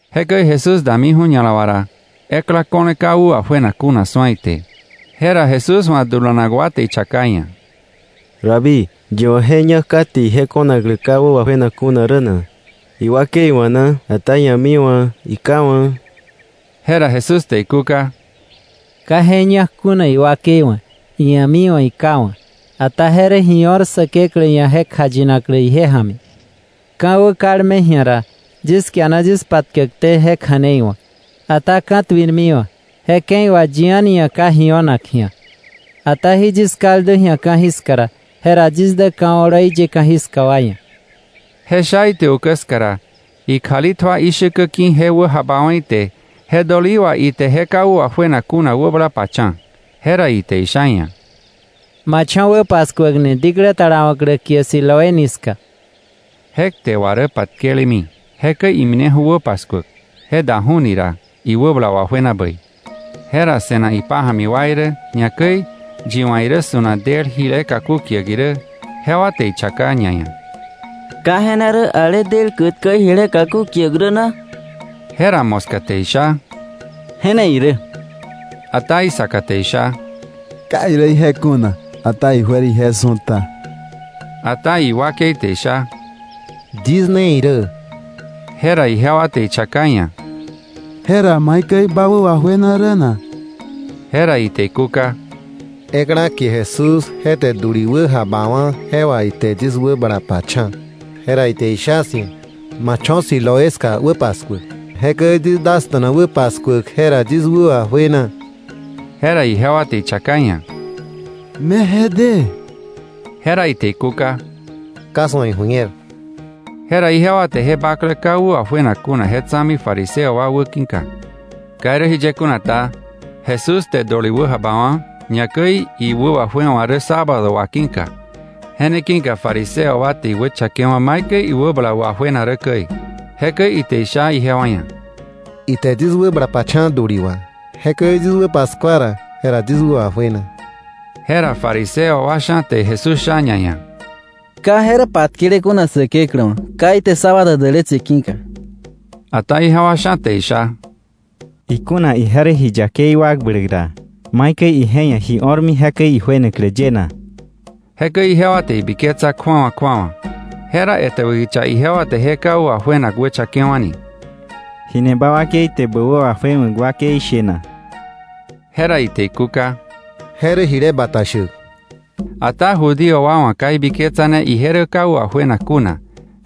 Jekäi Jesús damiju̱ ña̱la wà ra, ekla ko̱le ka wä wajuenak kuna su̱a ite. Jera Jesús wa̱ dulanak wa te ichaka iia̱: —Rabí, ¿yi wa̱ je ñak kate ije ko̱naklä ka wä wajuenak kuna rä na? ¿Iwakei wa̱ na, ata ia̱mi wa̱, iká wa̱? Jera Jesús te ikúka: —Ka je ñak kuna iwakei wa̱, ia̱mi wa̱, iká wa̱. Ata je rä ji o̱r Säkeklä ia̱ je kjayinaklä ije ja̱mi. Ka̱wä kalme ji̱a ra, yis kiana yis patkäkté je kja̱nei wa̱k. Ata ka̱tuirmiwa̱, je ke̱i wà yi a̱ni ia̱ ka ji o̱nak ji̱a. Ata jí yis kaldu ji̱a ka̱jiska ra, jera yis dä ka̱ oloi ye ka̱jiska wa ia̱. Je sha ite ukä ska ra, ikjali tjua ishäkä ki̱ je wäjabawa̱ ite, je dölií wà ite je ka wä wajuenak kuna wäbala pacha̱. Jera ite isha iia̱: —Ma cho̱ wä paskuäkni diklä talawa̱klä kie Siloéni ska. (Je kte wà rä patkelemi). Jekäi imineju̱ wä paskuäk; je daju̱ni ra iwäbala wajuena bäi. Jera se̱nak ipája̱mi wa irä, ñakäi yi wa̱ irä su̱nak del jile kaku kiäk irä, jewa te ichaka ñaia̱: —¿Ka je ne rä ale del kätkä jile kaku kiäk rä na? Jera moska te isha; —Je ne irä. Ata isaka te isha: —Ka irä je kuna, ata ijuer ije su̱ta. Ata iwakei te isha: —Yis ne irä. Jera ijewa te ichaka iia̱: —Jera, ¿maikäi bä wä wajuena rä na? Jera ite ikúka: —Ekla kie Jesús, je te döli wäjabawa̱, je wà ite yis wäbala pacha̱. Jera ite isha 'sia̱: ‘Ma cho̱ Siloé ska wä paskuäk.’ Jekäi yis dasta̱na wä paskuäk. Jera yis wä wajuena. Jera ijewa te ichaka iia̱: —¿Me je de? Jera ite ikúka: —Ka 'swa̱ iju̱ñer. Jera ijewa te je bakle ka wä wajuenak kuna je tsa̱mi fariseo wa wäki̱ka. Ka irä jiye kuna ta, Jesús te döli wäjabawa̱, ñakäi iwä wajuewa̱ rä sábado wà ki̱ka. Je ne ki̱ka fariseo wa te iwächakewa̱ maikäi iwäbala wajuena rä käi. Jekäi ite isha ijewa ia̱: —Ite yis wäbala pacha̱ döli wà; jekäi yis wä paskua ra, jera yis wä wajuena. Jera fariseo wa sha̱ te Jesús sha ñaia̱: —Ka je rä patkele kuna Säkeklä wa̱, ka ite sábado dälätse ki̱ka. Ata ijewa sha̱ te isha: —Ikuna ije rä ji yakei wakbläk ra, ¿maikäi ije ia̱ ji o̱r jekäi ijuenaklä ye na? Jekäi ijewa te ibiketsa kju̱awa kju̱awa. Jera etäbä kicha ijewa te je ka wä wajuenak wächakewa̱ni: —¿Ji ni ba wakei te bä wä wajuewa̱k wakei she na? Jera ite ikúka: —Je rä jile bata shäk. Ata Judío wa wa̱ ka ibiketsane ije rä ka wä wajuenak kuna,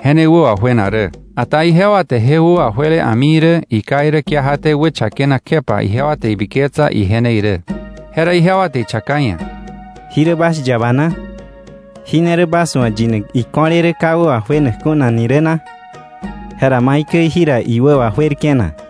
je ne wä wajuena rä, ata ijewa te je wä wajuele a̱mi irä iká irä kiajaté wächakenak kjepa ijewa te ibiketsa ije ne irä. Jera ijewa te ichaka iia̱: —¿Jí rä bas yaba na? ¿Jí ne rä bas wa̱ yinak iko̱le rä ka wä wajuenak kuna ni rä na? Jera ¿maikäi jira iwä wajuerke̱ na?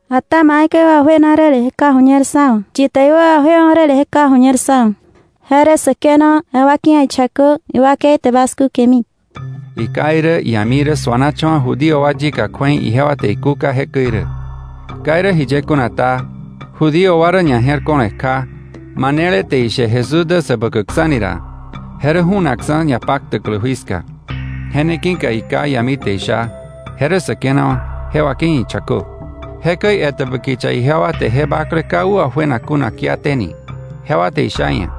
Ata maikäi iwä wajuenani räle je ka ju̱ñer sá wa̱. Yi te iwä wajuewa̱ räle je ka ju̱ñer sá wa̱. Je rä säkenawa̱, je wakei ia̱ ichakö. Iwakei te bas kúkemi. Iká irä ia̱mi irä suanacha̱wa̱ Judío wa yika kju̱ei ijewa te ikúka jekäi rä. Ka irä jiye kuna ta, Judío wa rä ñaje̱rko̱le kja, manele te ishe Jesús dä Säbäkäkksa̱ ni ra, je rä ju̱nakksa̱ ñapaktäklä jui ska. Je ne ki̱ka iká ia̱mi te isha: “Je rä säkenawa̱, je wakei ia̱ ichakö.” Jekäi etäbä kicha jewa te je bakle ka wä wajuenak kuna kiateni. Jewa te isha iia̱: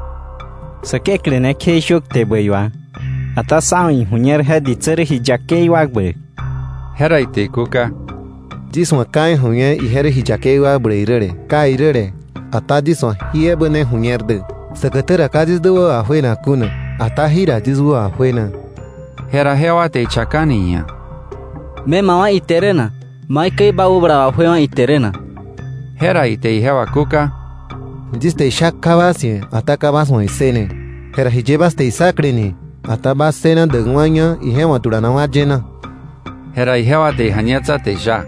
—Säkeklä ne kjeishö kte bäi wà. Ata sá wa̱ iju̱ñer je ditsä rä ji yakei wakbläk. Jera ite ikúka: —Yis wa̱ ka iju̱ñer ije rä ji yakei wakbläk räle, kai räle, ata yis wa̱ jí ebä ne ju̱ñer dä: Säkätä ra ka yis dä wä wajuenak kuna, ata jira yis wä wajuena. Jera jewa te ichakani iia̱: —¿Me ma wá̱ ite rä na? ¿Maikäi ba wäbala wajuewa̱ ite rä na? Jera ite ijewa kúka: —Yis te isha kja bas ia̱, ata ka bas wa̱ issëne. Jera ¿jiye bas te issakle ni? Ata ¿bas ssëna däkwa̱ña ije wa̱ dulanak wa ye na? Jera jewa te ija̱ñetsa te isha: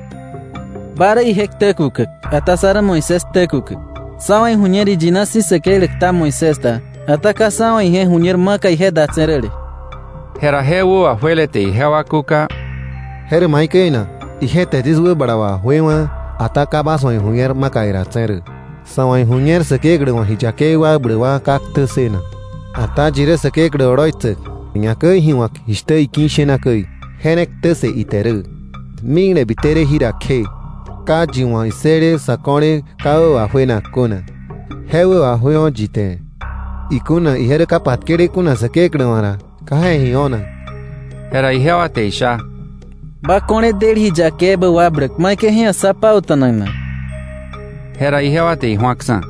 —Ba rä ije ktä kukäk. Ata sá rä Moisés ktä kukäk. Sá wa̱ iju̱ñer iyina si̱ Säkeklä kta Moisés da. Ata ka sá wa̱ ije ju̱ñer maka ije datse̱ räle. Jera je wä wajuele te ijewa kúka: —¿Je rä maikäi na? Ije te yis wäbala wajuewa̱, ata ka bas wa̱ iju̱ñer maka idatse̱ rä. Sa̱ wa̱ iju̱ñer Säkeklä wa̱ ji yakei wakbläk wa ka ktä ssënak, ata yi rä Säkeklä oloitsäk ñakäi ji wa̱k jishtä iki̱ ishena käi, je ne ktä ssë ite rä. Mikle bite rä jira kje ka yi wa̱ issële sa̱ ko̱le ka wä wajuenak kuna je wä wajuewa̱ yi te. Ikuna ije rä ka patkele kuna Säkeklä wa̱ ra, ka je ia̱ ji o̱nak. Jera ijewa te isha: —Ba ko̱le del ji yakei ebä wakbläk ¿maikäi je ia̱ sá pauta̱nak na? Jera ijewa te iju̱aksa̱.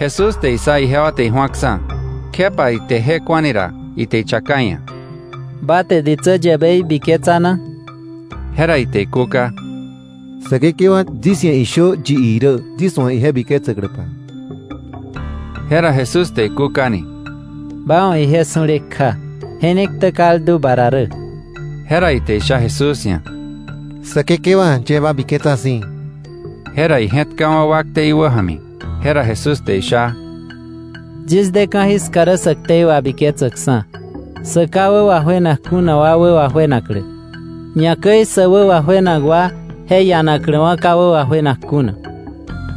Jesús te issa ijewa te iju̱aksa̱, kjepa ite je ku̱ani ra, ite ichaka iia̱: —¿Ba te ditsä yäbei biketsa na? Jera ite ikúka: —Säkekewa, yis ia̱ ishö yi irä yis wa̱ ije biketsäkläpa. Jera Jesús te ikúkani: —Ba wa̱ ije su̱le kja. Je ne ktä kaldu ba ra rä. Jera ite isha Jesús ia̱: —Säkekewa, yie ba biketsa si̱. Jera ije̱tkawa̱ wakte iwäja̱mi. Jera Jesús te isha: —Yis de ka̱jiska rä sä ktei wabiketsäkksa̱, sä ka wä wajuenak kuna wa wä wajuenaklä, ñakäi sä wä wajuenak wa je ianakläwa̱ ka wä wajuenak kuna.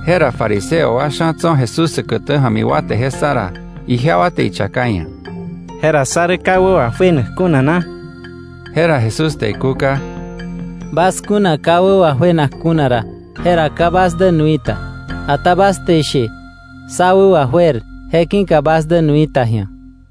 Jera fariseo wa sha̱ tso̱ Jesús säkätä ja̱mi wa te je ssa ra, ijewa te ichaka iia̱: —Jera ¿sá rä ka wä wajuenak kuna na? Jera Jesús te ikúka: —Bas kuna ka wä wajuenak kuna ra, jera ka bas dä nui ta. Ata bas te ishe: ‘Sá wä wajuer’, je ki̱ka bas dä nui ta ji̱a.